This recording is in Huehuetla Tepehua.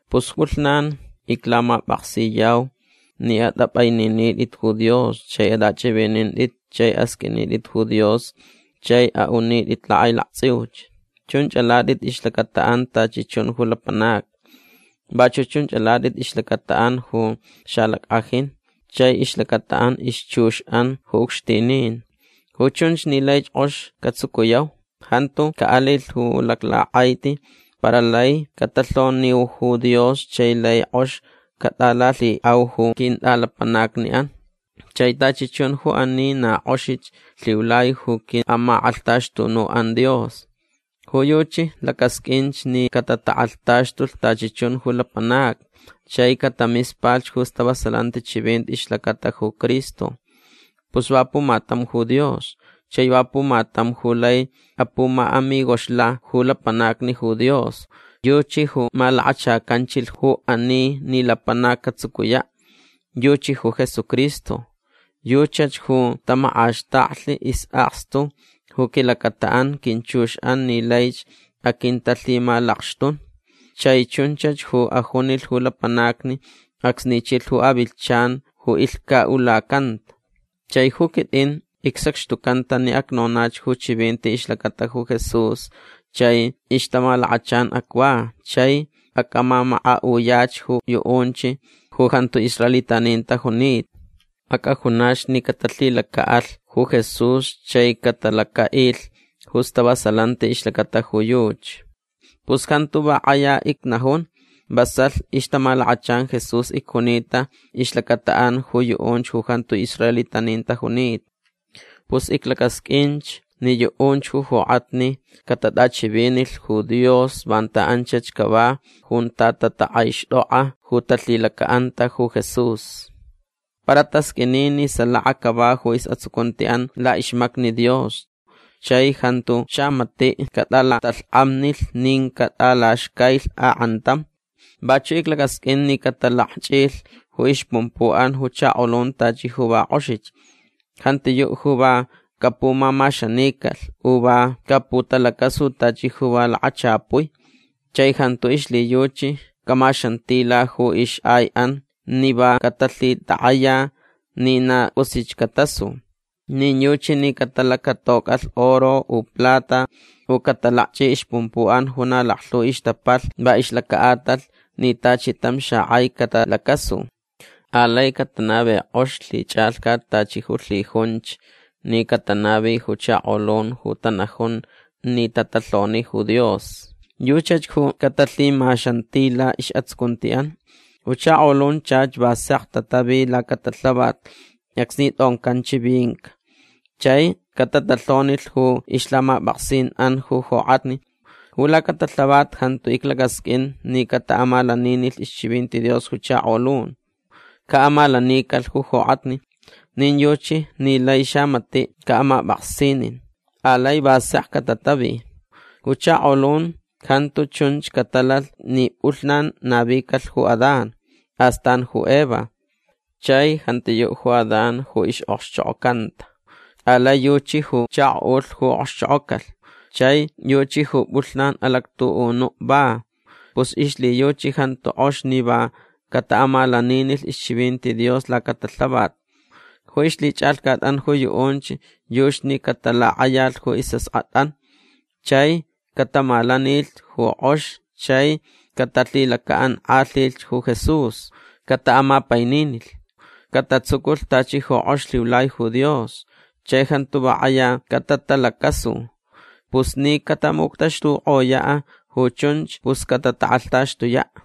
Pus pʼulhnan iclamapʼaksiyau ni atʼapʼaininitʼit ju Dios chai atʼachʼivinintʼit chai asqʼuinitʼit ju Dios chai aʼunitʼit lakʼailaktsʼiuch. Chunch alatʼit ixlacataʼan tachi chun ju lapanacni. Vachuʼ chunch alatʼit ixlacataʼan ju xalackʼajin chai ixlacataʼan ixchuxʼan ju ucxtinin. Ju chunch ni laich kʼox catsucuyau. Jantu caʼalilh ju laclakʼaiti para lai catalhoniu ju Dios chai lai kʼox catʼalalhiʼau ju quintʼalapanacniʼan. Chai tachi chun ju ani na kʼoxich lhiulai ju quiʼamakʼalhtaxtunuʼan Dios. Ju yuchi lacasqʼuinch ni catatakʼalhtaxtulh tachi chun ju lapanacni chai catamispalh ju stavasalanti chivinti ixlacata ju Cristo. Pus va pumatam ju Dios. Chai va pumatam ju lai apumaʼamigoxla ju lapanacni ju Dios. Yuchi ju malakachacanchilh ju ani ni lapanac catsucuyaʼ. Yuchi ju Jesucristo. Yuchach ju tamakʼaxtaklh isʼakstu ju quilacataʼan quinchuxʼan ni laich aquintalhimalakxtun. Chai chunchach ju ajunilh ju lapanacni acsni chilh ju avilhchan ju ilhcaʼulacanta. Chai ju quitʼin icsacxtucanta ni acnonach ju chivinti ixlacata ju Jesús chai ixtamalakachan acva chai acʼamamakaʼuyach ju yuʼunch ju jantu israelitanin tajunita. Acʼajunach ni catalhilacaʼalh ju Jesús chai catalacaʼilh ju stavasalanti ixlacata ju yuchi. Pus jantu va kʼaya icnajun. Vasalh ixtamalakachan Jesús icjunita ixlacataʼan ju yuʼunch ju jantu israelitanin tajunita. Pus iclacasqʼuinch ni yuʼunch ju jokʼatni catatʼachivinilh ju Dios vanta anchach cava junta tatakʼaixtʼokʼa ju talhilacaʼanta ju Jesús. Para tasqʼuini ni salaka cava ju isʼatsucuntiʼan laʼixmacni Dios chai jantu xamatiʼ catʼalatalhkʼamnilh nin catʼalaxcailh akʼantam. Vachuʼ iclacasqʼuin ni catalakchʼilh ju ixpumpuʼan ju chakolun tachi ju va kʼoxich. Jantiyuʼ ju va capumamaxanicalh u va caputalacasu tachi ju va lakachapui. Chai jantu ixlhiyuchi camaxantila ju ixʼaiʼan ni va catalhitakʼaya ni na cʼusich catasu. Nin yuchi ni catalacatocʼalh oro u plata u catalakchʼi ixpumpuʼan ju na laklhu ixtapalh va ixlacaʼatalh ni tachi tam xakʼai catalacasu. Alai catanavi kʼox lhichʼalhcat tachi ju lhijunch ni catanavi ju chakolun ju tanajun ni tatalhoni ju Dios. Yuchach ju catalhimaxantila isʼatsucuntiʼan. Ju chakolun chach va sek tatavi lacatalhavat acsni tʼoncan chivinca. Chai catatalhonilh ju ixlhamapʼaksinʼan ju jokʼatni. Ju lacatalhavat jantu iclacasqʼuin ni cataʼamalaninilh ixchivinti Dios ju chakolun. Caʼamalanicalh ju jokʼatni. Nin yuchi ni lai xamatiʼ caʼamapʼaksinin. Alai va sek catatavi. Ju chakolun jantu chunch catalalh ni pʼulhnan navicalh ju Adán. Astan ju Eva. Chai jantiyuʼ ju Adán ju ixʼokxchokʼocanta. Alai yuchi ju chakoʼulh ju okxchokʼocalh chai yuchi ju pʼulhnan alactuʼunuʼ va. Pus ixlhiyuchi jantu kʼox ni va cataʼamalaninilh ixchivinti Dios lacatalhavat. Ju ixlhichʼalhcatʼan ju yuʼunch yuchi ni catalakʼayalh ju isʼaskʼatʼan chai catamalanilh ju kʼox chai catalhilacaʼankʼalhilh ju Jesús. Cataʼamapaininilh. Catatsuculh tachi ju kʼox lhiulai ju Dios. Chai jantu va kʼaya catatalacasu. Pus ni catamuctaxtukʼoyaʼ ju chunch pus catatakʼalhtaxtuyaʼ.